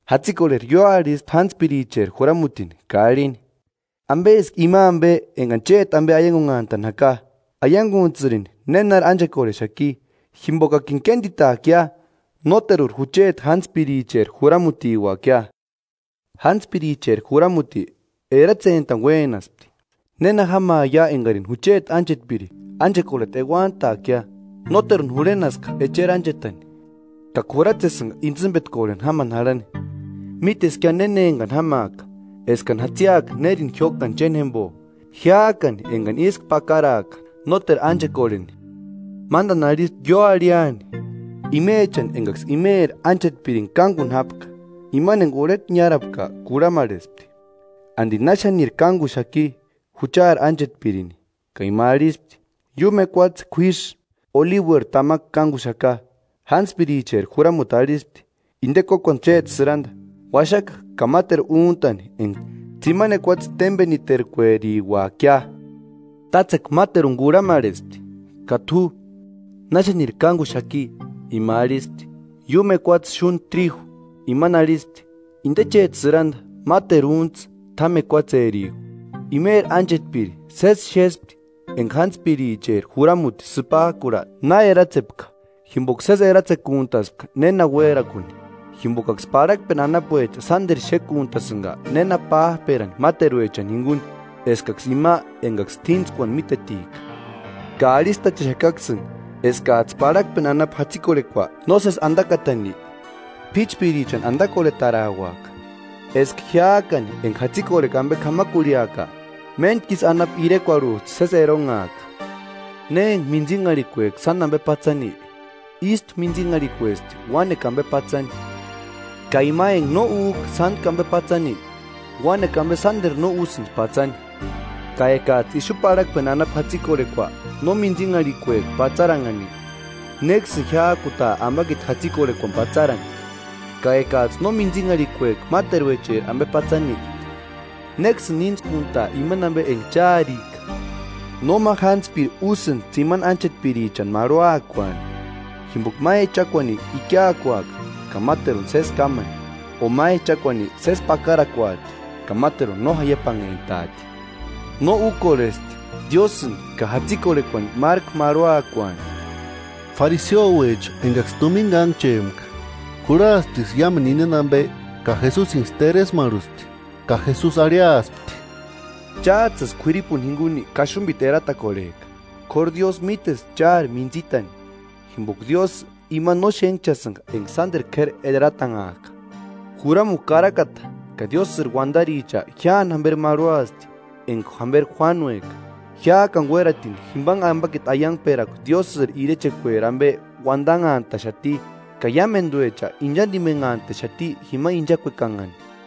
Jatsikorheri ióarhispti jántspiricheri juramutini ka arhini: ‘¿Ambeski ima ambe engani chéti ambe aiangunhantani jaka? Aianguntsïrini nénari ánchekorhexaki, jimbokakini kénditaakia; nóteruri jucheti jántspiricheri juramutiuakia.’ Jántspiricheri juramuti eratsentani uénaspti: ‘¿Néna jámaia engarini jucheti ánchetpiri ánchekorheta euantaakia? Nóteruni jurhenaska echeri ánchetani, ka k'uratsesïnga intsïmbetkorheni jámani jarhani. Míteskia néna engani jámaaka eskani jatsiaka nérini jiókaa chénjembo jiájkani engani ísku pakaraaka nóteru ánchekorheni.’ Mándani arhispti ióarhiani imechani engaksï imeri ánchetpirini kánguni jápka. Imani enga urheta niárapka kurhamarhespti ‘¿Andi náxaniri kánguxaki juchari ánchetpirini?’ Ka ima arhispti: ‘Iúmu ekuatse k'uísï olibueri tamakua kánguxaka.’ Jántspiricheri juramuti arhispti: ‘Inde kókuani chéti sïranda; uaxaka ka máteru úntani enga tsimani ekuatse témbeniterkueriuakia.’ Tátsekua máteruni kurhamarhespti: ‘Ka t'u, ¿Na xániri kánguxaki?’ Ima arhispti: ‘Iúmu ekuatse xúndi tríju.’ Imani arhispti: ‘Inde chéti sïranda; máteru úntsï, t'ámu ekuatserijku.’” “Imeri ánchetpiri sési xéspti enga jántspiricheri juramuti sïpajkurha na eratsepka jimboka sési eratsekuntaspka néna uérakuni. Jimbokaksï parhakpeni anapuecha sánderu xékuntasïnga néna pájperani máteruechani jinguni eskaksï ima engaksï t'íntskuani mítetika.” “Ka arhistachexakaksïni eskajtsï parhakpeni anapu jatsikorhekua nósesi andakatani, p'íchpirichani andakorhetarauaka, eska jiájkani enga jatsikorhekua ambe k'amakurhiaaka, méntku ísï anapu irekuarhujtsï sési eronhaaka.” “Ne enga mintsinharhikueka sáni ambe patsani, ístu mintsinharhikuesti uánekua ambe patsani; ka ima enga no újka sántku ambe patsani, uánekua ambe sánderu no úsïndi patsani. Ka ekajtsï ixu parhakpeni anapu jatsikorhekua no mintsinharhikueka patsaranhani, ¿Néksïni jiájkutaa ambakiti jatsikorhekuani patsarani? Ka ekajtsï no mintsinharhikueka máteruecheri ambe patsani, ¿Néksïni íntskuntaa imani enga chárika?” “Nóma jántspiri úsïndi tsimani ánchetpirichani marhuakuaani; jimboka ma echakuani ikiakuaka ka máteruni sési kámani, o ma echakuani sési pakarakuati ka máteruni no jaiapanhentaati. No úkorhesti Diósïni ka jatsikorhekuani márku marhuakuani.” Fariseouecha engaksï tumina kánhchempka, kurhasptiksï iámu indeni ambe ka Jesusinksï teresmarhuspti. Ka Jesusi arhiaspti: “Chájtsïsï k'uiripuni jinguni kaxumbiti eratakorhejka, k'óru Diósï mítesti chári mintsitani; jimboka Diósï imani no xénhchasïnga enga sánderu k'éri eratanhajka.” “Juramukua karakata ka Diósïri uandaricha jíani jamberi marhuasti enga jamberi Juánueka. Jiájkani uératinitki jimbanhe ambakiti aiangperakua Diósïri irechekueri ambe uandanhantaxati, ka iámenduecha inchandimenhantaxati jima inchakuekanhani.”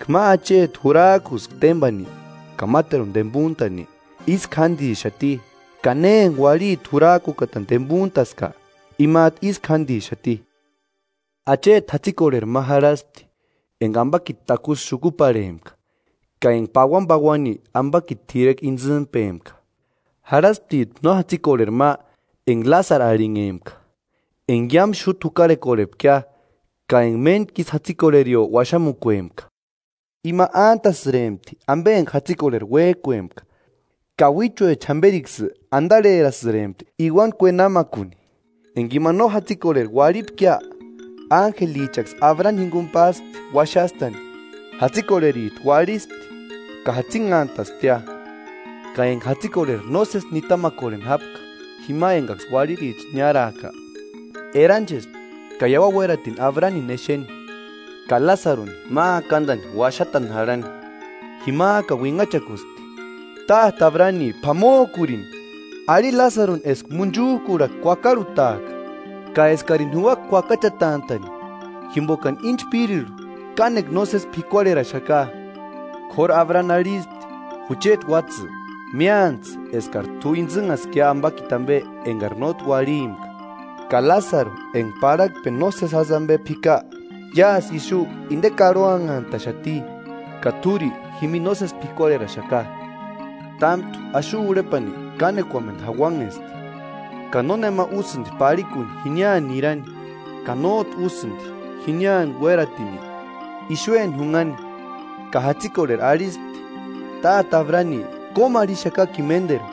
“Eka ma acheti jurajkuska témbani ka máteruni tembuntani, ísku jándixati; ka ne enga uarhiti jurajkukatani tembuntaska imajtu ísku jándixati.” “Acheti jatsikorheri ma jarhaspti, enga ambakiti takusï xukuparhempka ka enga pauanipauani ambakiti t'irekua intsïmpempka. Jarhasptijtu no jatsikorheri ma enga Lásaru arhinhempka, enga iámu xúta jukarhekorhepkia ka enga méntkisï jatsikorherio uaxamukuempka. Ima ántasïrempti ambe enga jatsikorheri uéjkuempka; ka uíchuecha jamberiksï andarherasïrempti iuani kuenamakuni. Enga ima no jatsikorheri uarhipkia, ánjelichaksï Abrani jinguni páspti uaxastani. Jatsikorherijtu uarhispti ka jatsinhantasptia.” “Ka enga jatsikorheri nósesi nitamakorheni jápka jima engaksï uarhiricha niárajka, eranchespti ka iauani uératini Abranini exeni, ka Lásaruni ma akandani uaxatani jarhani. Jimajkani uinhachakuspti: ‘¡Táte Abrani p'amojkurini! Arhi Lásaruni eska munchujkurhakua kuakarhutaaka ka eskarini juuaka kuakachatantani, jimbokani íni chpírirhu kánekua nósesi p'ikuarheraxaka.’ K'óru Abrani arhispti: ‘Jucheti uátsï, míantsï eskari t'u intsïnhaskia ambakiti ambe engari nótki uarhimpka, ka Lásaru enga parhakpeni nósesi jásï ambe p'ika. Iásï ixu inde karhoanhantaxati, ka t'úri jimini nósesi p'ikuarheraxaka. Támtu axu urhepani kánekuamendu jauanhesti; ka nónema úsïndi parhikuni jiniani nirani ka nójtu úsïndi jiniani uératini ixueni junhani.’” “Ka jatsikorheri arhispti: ‘Táte Abrani kómarhixakakini ménderu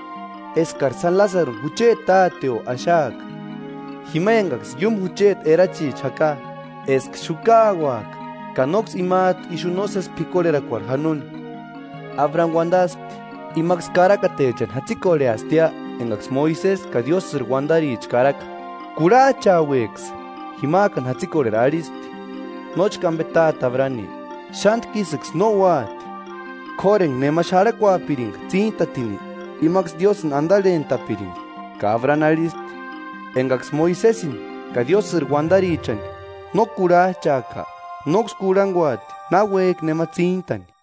eskari sáni Lásaruni jucheti táteo axaaka, jima engaksï iúmu jucheti erachiecha jaka, eska xukauaka ka nóksï imajtu ixu nósesi p'ikuarherakuarhu janoni.’ Abrani uandaspti: ‘Imaksï karakatechani jatsikorheastia engaksï Moisesi ka Diósïri uandaricha karaka: ¡Kurhajchaueksï!’ Jimajkani jatsikorheri arhispti: ‘Nóchka ambe Táte Abrani, xántku ísïksï no úati; k'óru enga nema xarhakuapiringa tsíntatini, imaksï Diósïni andarhentapirindi.’ Ka Abrani arhispti: ‘Engaksï Moisesini ka Diósïri uandarichani no kurhajchajka, nóksï kurhanguati náuejki nema tsíntani.’”